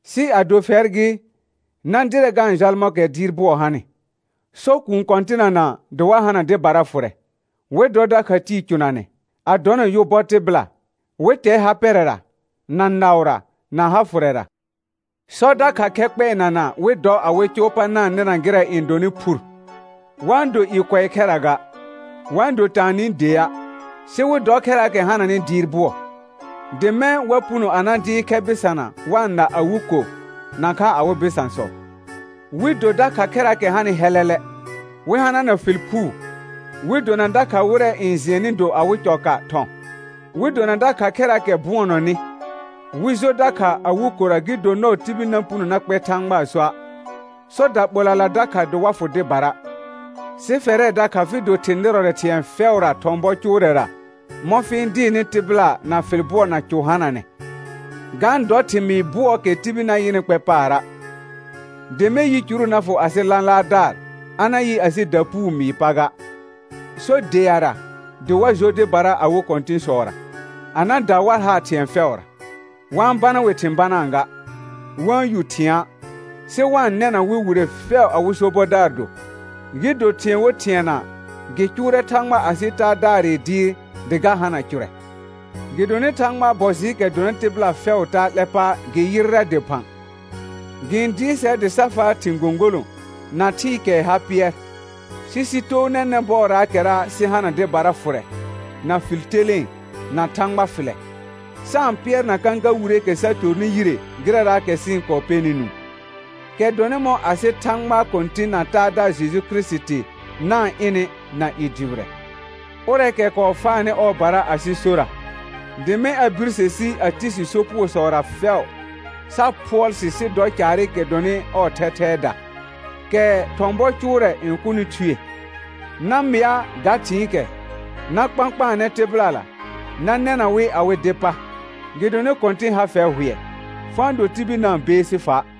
Sɩ ado fɛr gɩ, na dɩrɛ ga-n jal mɔ̃kɛ dɩɩr bʋɔ hanɩ. Sɔ kũu kɔ̃tɩnana dɩ wa hana dɩbara fʋrɛ, wɩ dɔ dakha tɩɩ cʋnanɛ, a dɔna yʋ bɔ tɩbɩla, wɩ tɛ ha pɛrɛra, na naʋra, na ha fʋrɛra. Sɔ dakha khɛ kpɛɛnana wɩ dɔ awɩ cʋʋ pa na-n nɩna gɩrɛ n dɔnɩ phur; wa-n do i kʋɛ khɛra ga, wa-n do taanɩ dea', sɩ wɩ dɔ khɛraakɛ hananɩ dɩɩr bʋɔ, dɩ mɛ̃ wa puno a na dɩɩr khɛ bɩsana wa-n na awɩ ko, nakha awɩ bɩsãsɔ, wɩ do dakha khɛraakɛ hanɩ hɛlɛlɛ, wɩ hanana fɩl phuu, wɩ dona dakha wɩrɛ n jɩɛnnɩ do awɩ cɔka thɔ̃, wɩ dona dakha khɛraakɛ bʋɔnɔnɩ, wɩ jo dakha awɩ kora gɩ do nɔɔ tibil na puno na kpɛ Thãgbaa soa'. Sɔ daɓolala dakha dɩ wa fʋ dɩbara; sɩ fɛrɛ dakha fɩ do thɩ̃ nɩrɔrɛ thɩ̃ɛ fɛʋra thɔ̃ bɔ cʋʋrɛra mɔ̃ fɩ-n dɩɩrnɩ tɩbɩla na fɩl bʋɔ na cʋ hananɛ, ga-n dɔ thɩmɩɩ bʋɔɔkɛ tibil na yɩnɩ kpɛ paara', dɩ mɛ̃ yicuru na fʋ asɩ lãlaardaar a na yɩ asɩ dapuu mɩɩ pa ga. Sɔ deara dɩ wa jo dɩbara awɩ kɔ̃tɩ̃sɔra, a na da war haar thɩ̃ɛ fɛʋra, wa-n bana wɩ thɩ̃ banaa ga, wa-n yu thɩ̃a', sɩ wa-n nɛna wɩ wire fɛʋ awɩ sobɔdaar do, gɩ do thɩ̃ɛ wo thɩɛna gɩ cʋʋrɛ Thãgba asɩ Taadaarɩ dɩɩr dɩ ga hana cʋrɛ. Gɩdonɩ Thãgbaa bɔ jɩɩkɛ dɔnɩ tɩbɩla fɛʋʋ taa 'lɛ pa gɩ yɩrrɛ dɩphã; gɩ-n dɩɩr sɛr dɩ sa faa thɩ̃ gõgolõ na thɩɩkɛɛ ha pɩɛr, sɩ sɩ too nɛnɛ̃ bɔɔraakɛra sɩ hana dɩbara fʋrɛ, na fɩl telẽe, na Thãgba fɩlɛ, sa-n pɩɛrna kãka wireekɛ sa tornɩ yire gɩrɛra sɩ-n kɔɔ pɛnɩ nũu, kɛ dɔnɩ mɔ̃ asɩ Thãgba Kɔ̃tɩ̃ na Taadaar Jeju Kirisiti na-n ɩnɩ na i dʋbɩrɛ. Ʋrɛɛkɛ kɔɔ faanɩ ɔɔbara asɩ sora, dɩ mɛ̃ a birse si a ti si sopugosɔra fɛʋ, sa phʋɔl sɩ sɩ dɔ caarɩkɛ dɔnɩ ɔɔ thɛthɛɛda, kɛ thɔ̃ bɔ cʋʋrɛ n kʋnɩ thue. Na mɩa ga thɩ̃ɩkɛ, na kpãkpaanɛ tɩbɩlala, na nɛna wɩ awɩ dɩ pa, gɩdonɩ Kɔ̃tɩn ha fɛr hʋɛ. Fa-n do tibil na-n beesi fa'.